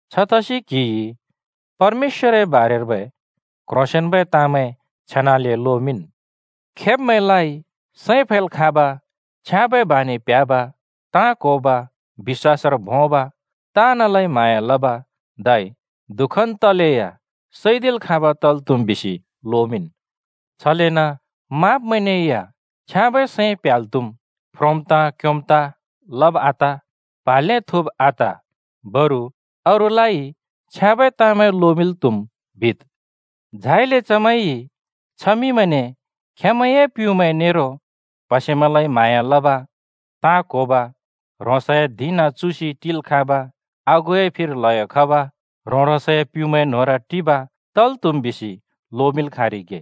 छतसि क्‍हिइ परमेश्‍वरए बारेर्बै क्ह्रोंसेंन्बै ताँमैं छेनाले लोमिंन्। खेब्‍मैंलाइ “सैं फैल् खाँब, छ्याँबै बानि प्‍ह्‍याब, ताँ क्होब, बिश्‍वासर भोंब, ताँनलाइ म्हाँया लब, धै दुःखन् तलेया सैदिल् खाँब तल् त्हुम्,” बिसि लोमिंन्। छलेन माँब्‍मैंने या “छ्याँबै सैं प्‍ह्‍याल् त्‍हुम्, फ्रोम् ताँ क्योम् ताँ लब आत, प्हा ल्‍हें थुँब आत। बरु अरूलाइ छ्याँबै ताँमैं लोमिंल् त्‍हुम्,” बिद्। झाइले चमैंइ छमिंमैंने “खेंमैंए प्‍युँमैं नेरो प्‍हसेमैंलाइ म्हाँया लब, ताँ क्होब, ह्रोंसए धिं नाँ चुसि टिल् खाँब, आगुए फिर ल्हयो खब, ह्रों-ह्रोंसए प्‍युँमैंए न्होंर टिब तल् त्हुम्,” बिसि लोमिंल् खाँरिगे।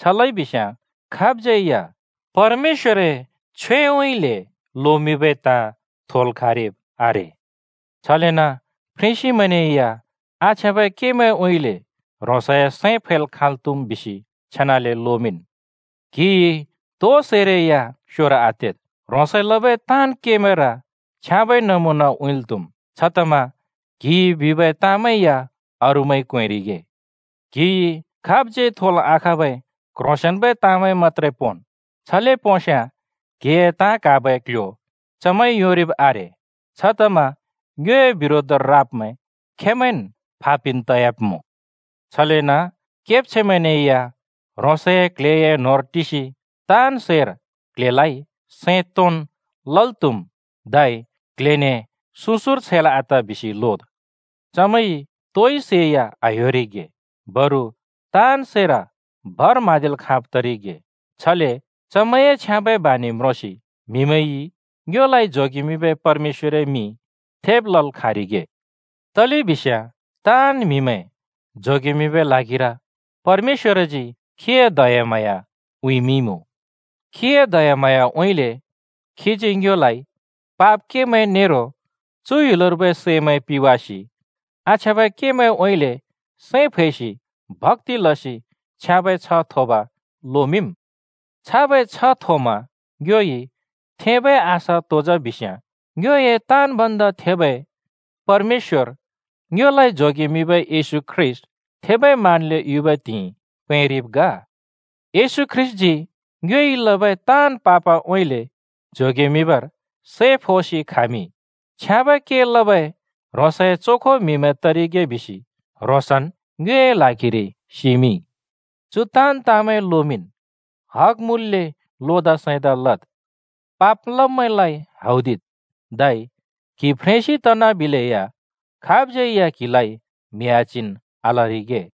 छ लइ बिस्‍याँ खाबज्यै या परमेश्‍वरए छ्वेउँइँले लोमिंबै ताँ थोल् खाँरिब् आरे। छलेन फ्रेंसिमैंने या आछ्याँबै केमैंउँइँले ह्रोंसए सैं फैल् खाँल् त्हुम् बिसि छेनाले लोमिंन्। क्हिइ तो सैरै या स्योर आतेद्, ह्रोंसइ लबै ताँन् केमैंर छ्याँबै नमुना उँइँल् त्‍हुम्। छतमा क्हिइ बिबै ताँमैं या अरूइ क्वेंरिगे। क्हिइ खाबज्यै थोल् आखाँबै क्ह्रोंसेंन्बै ताँमैं मत्‍त्रे पोंन्, छले पोंस्‍याँ क्‍हिए ताँ क्हाबै क्ल्ह्‍यो चमैंइ योंरिब् आरे। छतमा ङ्योए बिरोधर राब्मैं खेंमैंन् फा पिन् तयाब्मुँ। छलेन केब्छैंमैंने या ह्रोंसए क्ल्हेए न्होंर टिसि ताँन् सैर क्ल्हेलाइ सैं तोंन् लल् त्‍हुम्, धै क्ल्हेने सुँ सुँर छैल् आत बिसि लोद्। चमैंइ तोइ सै या आह्‍योरिगे, बरु ताँन् सैर भर म्हाँदिल् खाँब तरिगे। छले चमैंए छ्याँबै बानि म्रोंसि म्हिमैंइ ङ्योलाइ जोगेमिंबै परमेश्‍वरए मिं थेब लल् खाँरिगे। तलेबिस्याँ ताँन् म्‍हिमैं जोगेमिंबै ल्हागिर परमेश्‍वरजी खीए दयाम्हाँया उँइँमिंइमुँ। खीए दयाम्हाँयाउँइँले खीजी ङ्योलाइ पाप केमैं नेरो चु ह्‍युलर्बै सैमैं पिवासि, आछ्याँबै केमैंउँइँले सैं फैसि, भक्‍ति लसि छ्याँबै छ्ह थोब लोमिंम्। छाबै छ्ह थोमा ङ्योइ थेंबै आशा तो जा बिस्याँ: ङ्योए ताँन् भन्दा थेबै परमेश्‍वर ङ्योलाइ जोगेमिंबै येशू ख्रीष्‍ट थेबै मानले युबै त्हिंइ पैंरिब् ग। येशू ख्रीष्‍टजी ङ्योइ लबै ताँन् पापउँइँले जोगेमिंबर सै फोसि खामिंइ। छ्याँबै के लबै ह्रोंसए चोखो म्हिमैं तरिगे बिसि ह्रोंसन् ङ्योए ल्हागिरि सिमिंइ। चु ताँन् ताँमैं लोमिंन्, हग मुँल्‍ले लोदा सैंदा लद्, पाप लब्‍मैंलाइ हौदिद्। धै क्हि फ्रेंसि तना निलेया खाबज्‍यै या क्‍हिलाइ म्हि आच्हिन् आलरिगे।